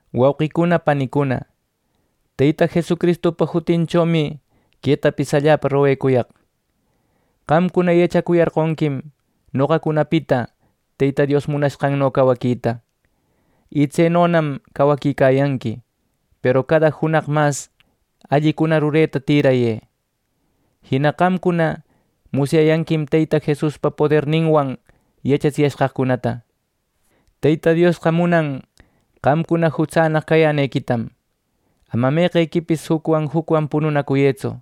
Wauqicuna panicuna, Teyta Jesucristupa jutinchomi quetapis allapa roguecuyaq. Qamcuna yachacuyarqonquim noqacunapita Teyta Dios munashqanno cawaquita. Y tsenonam cawaquicayanqui. Peru cada junaq mas allicuna rureta tirayë. Jina qamcuna musyayanquim Teyta Jesuspa poderninwan yachatsiyashqaqcunata. Teyta Diosqa munan qamcuna jutsannaq cayänequitam. Ama meqequipis jucwan jucwan pununacuyëtsu.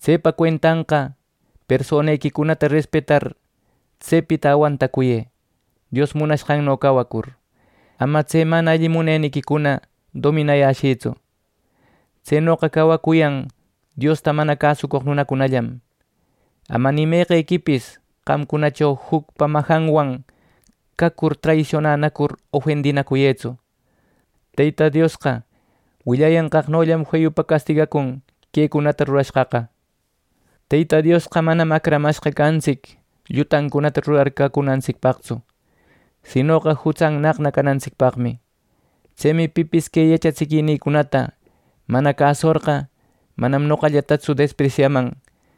Tsepa cuentanqa personequicunata respetar tsepita awantacuyë, Dios munashqanno cawacur. Ama tse mana alli muneniquicuna dominayäshïtsu. Tsenoqa cawacuyan Diosta mana cäsucoq nunacunallam. Ama ni meqequipis qamcunacho jucpa majanwan cacur traisionanacur ofendinacuyëtsu. Teyta Diosqa willayanqaqnollam feyupa castigacun quecunata rurashqaqa. Teyta Diosqa manam acramashqa cantsic llutancunata rurar cacunantsicpaqtsu, sinoqa jutsannaqna canantsicpaqmi. Tsemi pipis que yachatsiquinïcunata mana cäsucorqa, manam noqallatatsu despresyaman,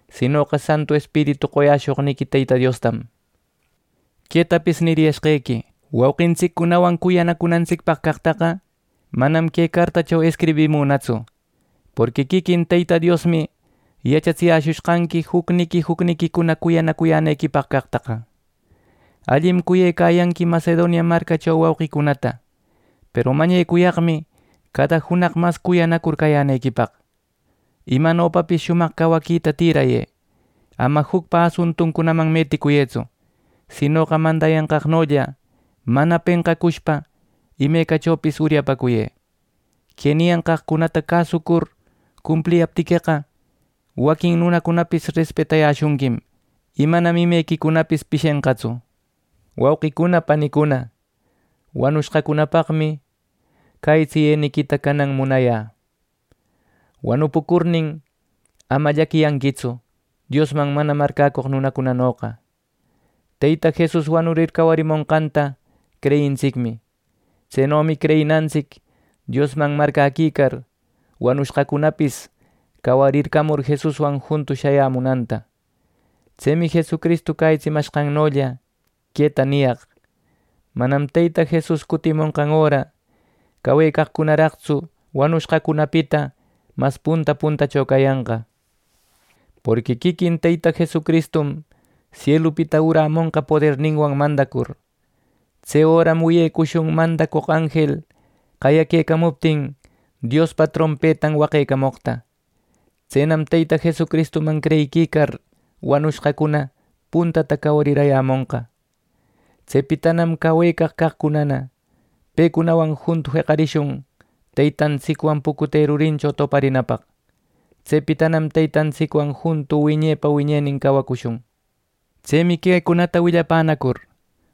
sinoqa Santu Espiritu qoyäshoqniqui Teyta Diostam. Quetapis niriyashqequi: Wauqintsiccunawan cuyanacunantsicpaq caqtaqa, manam que cartacho escribimünatsu, porqui quiquin Teyta Diosmi yachatsiyäshushqanqui jucniqui jucniquicuna cuyanacuyänequipaq caqtaqa. Allim cuyecayanqui Macedonia marcacho wauqicunata, peru mañecuyaqmi cada junaq mas cuyanacur cayänequipaq. Imanopapis shumaq cawaquita tirayë. Ama jucpa asuntuncunaman meticuyëtsu. Sinoqa mandayanqaqnolla mana penqacushpa imecachopis uryapäcuyë. Que niyanqaqcunata cäsucur cumpliyaptiqueqa, waquin nunacunapis respetayäshunquim y manam imequicunapis pishenqatsu. Wauqicuna panicuna, wanushqacunapaqmi cäyitsiyeniquita canan munayä. Wanupucurnin, ama llaquiyanquitsu Diosman mana marcäcoq nunacunanoqa. Teyta Jesus wanurir cawarimonqanta creyintsicmi. Tsenomi creyinantsic Diosman marcäquicar wanushqacunapis cawarimur Jesuswan juntu shayamunanta. Tsemi Jesucristu cäyitsimanqannolla, queta niyaq: Manam Teyta Jesus cutimonqan öra cawecaqcunaraqtsu wanushqacunapita mas punta puntacho cayanqa. Porqui quiquin Teyta Jesucristum sielupita urämonqa poderninwan mandacur. Tse öram wiyecushun mandacoq anjel qayaquecamuptin Diospa trompetan waqecamoqta. Tsenam Teyta Jesucristuman creyiquicar, wanushqacuna puntata cawariyämonqa. Tsepitanam cawecaq caqcuna pecunawan juntu jeqarishun Teytantsicwan pucute rurincho toparinapaq. Tsepitanam Teytantsicwan juntu wiñepa wiñenin cawacushun. Tsemi quecunata willapänacur,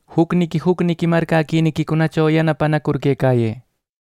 jucniqui jucniqui marcäquiniquicunacho yanapanacur quecayë.